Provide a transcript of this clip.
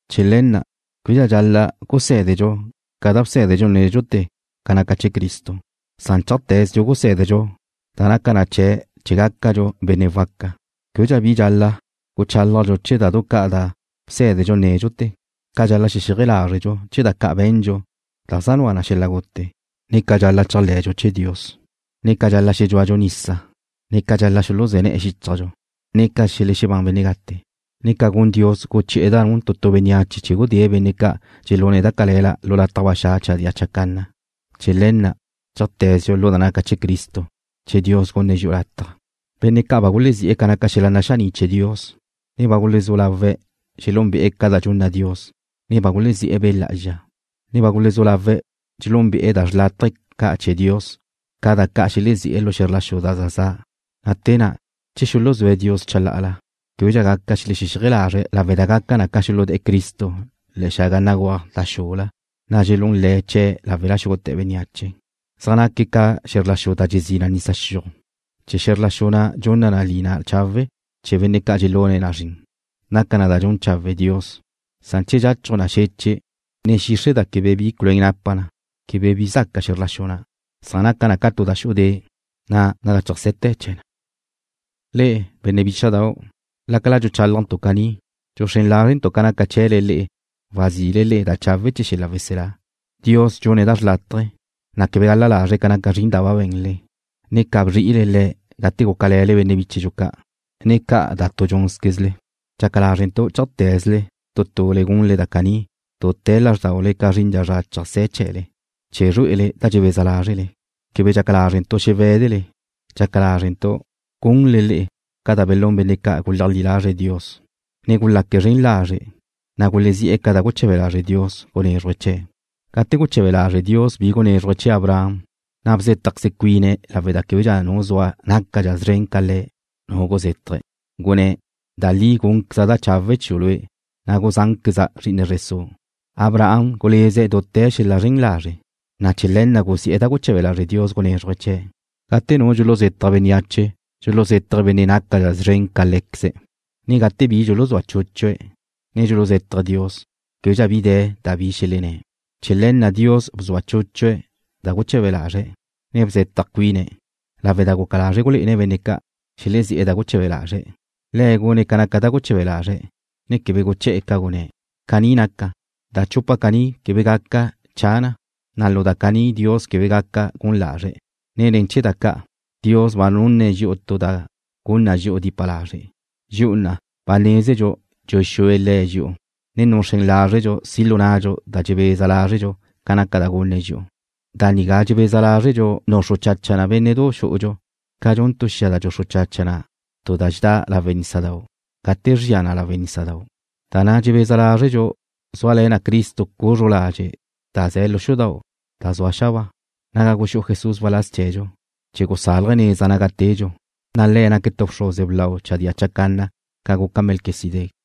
Chee̱ le̱ na' québedxa dxal-la' gusé̱dedxu ca da bsé̱dedxu nédxute̱ ca naca chee̱ Cristo, san chéajte̱zedxu gusé̱dedxu da naca chee̱' chee̱ gácadxu benne' waca. Québedxa bi dxal-la' guchálajdxu chee̱ da du ca' da bsé̱dedxu nédxute̱, ca dxal-la' xexéaje lázredxu chee̱ da ca' be̱ndxu da zaj nua na xel-la' gute, ne ca dxal-la' chéajle̱dxu chee̱ Dios, ne ca dxal-la' xedxúadxu nisa, ne ca dxal-la' xuluzé̱ ne̱'e̱ xíchajdxu, ne ca xelexebán benne' gate, ne ca gun Dios, guchi'e̱ da nun tu tu bénneache chee̱ gudée̱' benne' ca' dxelune̱' da cale̱la lu lataj ba xa' chadía chacanna. Chee̱ le̱ na' chéajte̱dxu lu da naca chee̱ Cristo, che Dios gunne̱' dxi'u lataj. Benne' ca' ba gulezí'e̱ ca naca xel-la' naxaní' chee̱ Dios, ne ba gulezú lawe' xelúnbe'e̱ da dxunna Dios, ne ba gulezí'e̱ Be' Lá'azxa, ne ba gulezú lawe' xelúnbe'e̱ da xrlátaje ca' chee̱ Dios ca naca da xelezí'e̱ lu xe̱zr la xu da za za', na' te na' che xuluzúe̱' Dios chalá'ala, québedxa gaca xelexexéaje lazre̱' lawe' da gaca na ca xuludé̱'e̱ Cristo le̱'e̱ xaga begúaj da xula, ne dxelún le̱' chee̱' láwela xúgute̱ bénneache. Zaj naque̱' ca xe̱zr la xu da dxezí na nisa xiuj. Che xe̱zr la xu na' dxunna lina chawe' chee̱ benne' dxelune̱' na zrin, naca na da dxun chawe' Dios, san che dxachuj na xeche', ne xixre' da quebe bi culuén napa na, quebe bi zaca xe̱zr la xu na', san naca na tu da xu'u de', na' naga chéajse̱te̱ chezxe na. Le'e, benne' bícha'dau', lácala dxuchálajntu' caní, dxuxrén lázrentu' ca naca chee̱le le'e wazile le'e da chawe' chee̱ xel-la' weselá. Dios dxune̱' da xlátaje̱, ne quebe gal-la lazre̱' ca naca zrin da ba be̱nle, ne ca bzri'ile Le̱' gate gúcale̱le benne' bíchedxu ca', ne ca da tu dxúnzquezle. Dxaca lázrentu' chéajte̱ze tu tule gunle da caní dute̱ lázrdaule ca zrin zra cheajsé̱ chee̱le, chee̱ zrué'ele da dxebeza lázrele. Quebe dxaca lázrentu' xewé̱dele. Dxaca lázrentu' gunle le'e ca belún benne' ca' guleajlí lazre̱' Dios, ne gulaque̱' zren lazre', na' gulezí'e̱ ca da guche̱be lazre' Dios gunézruje̱' chee̱'. Gate guche̱be lazre' Dios bi gunézruje̱' chee̱ Abraham, na' bzétajqueze cuine̱' lawe' da québedxa nu zua nácadxa szren ca Le̱', nu guzétaje̱', gunné̱': “Da li gúnqueza' da chawe' chiu' lue', ne guzánqueza' zri'ine zre su'.” Abraham guleze̱' dute̱ xel-la' zren lazre', na' chee̱ le̱ na' guzi'e̱ da guche̱be lazre' Dios gunézruje̱' chee̱'. Gate nu dxuluzetaj bénneache, dxuluzétaje̱' benne' nácadxe̱' szren ca lé̱queze̱', ne gate bi dxuluzúa chúchue̱', ne dxuluzétaje̱' Dios, québedxa bi de̱ da bi xelenné̱'. Chee̱ le̱ na' Dios bzua chúchue̱' da guche̱be lazre̱', ne bzetaj cuine̱', lawe' da guca lazre̱' gulé'ene̱' benne' ca' xelezí'e̱ da guche̱be lazre̱', Le̱' gune̱' ca naca da guche̱be lazre̱', ne quebe guché̱'e̱ ca gune̱'. Caní naca, da chupa caní quebe gaca cha na, na' lu da caní Dios quebe gaca gun lazre̱', ne ne̱ chee̱ da ca' Dios ba nunne̱' dxi'u tu da gun na dxi'u dipa lazre', dxi'u na' ba nézedxu dxuxúe Le̱' dxi'u, ne nuxrén lázredxu si' lu nnadxu da dxebeza lázredxu ca naca da gunne̱' dxi'u. Da nigá dxebeza lázredxu nuxru chacha na bénne'du xú'udxu ca dxun tu xia da dxuxru chacha na tu da dxedá lawe' nísadau' gate zria na lawe' nísadau'. Da na' dxebeza lázredxu zúale̱ na Cristo cuzru ladxe' da ze̱ lu xudau' da zua xabáa, naga guxú'u Jesús waláz chee̱dxu chee̱ gusálaje̱' neza naga tedxu, na' Le̱' naque̱' tu bxruze blau chadía chacanna ca guca Melquisedec.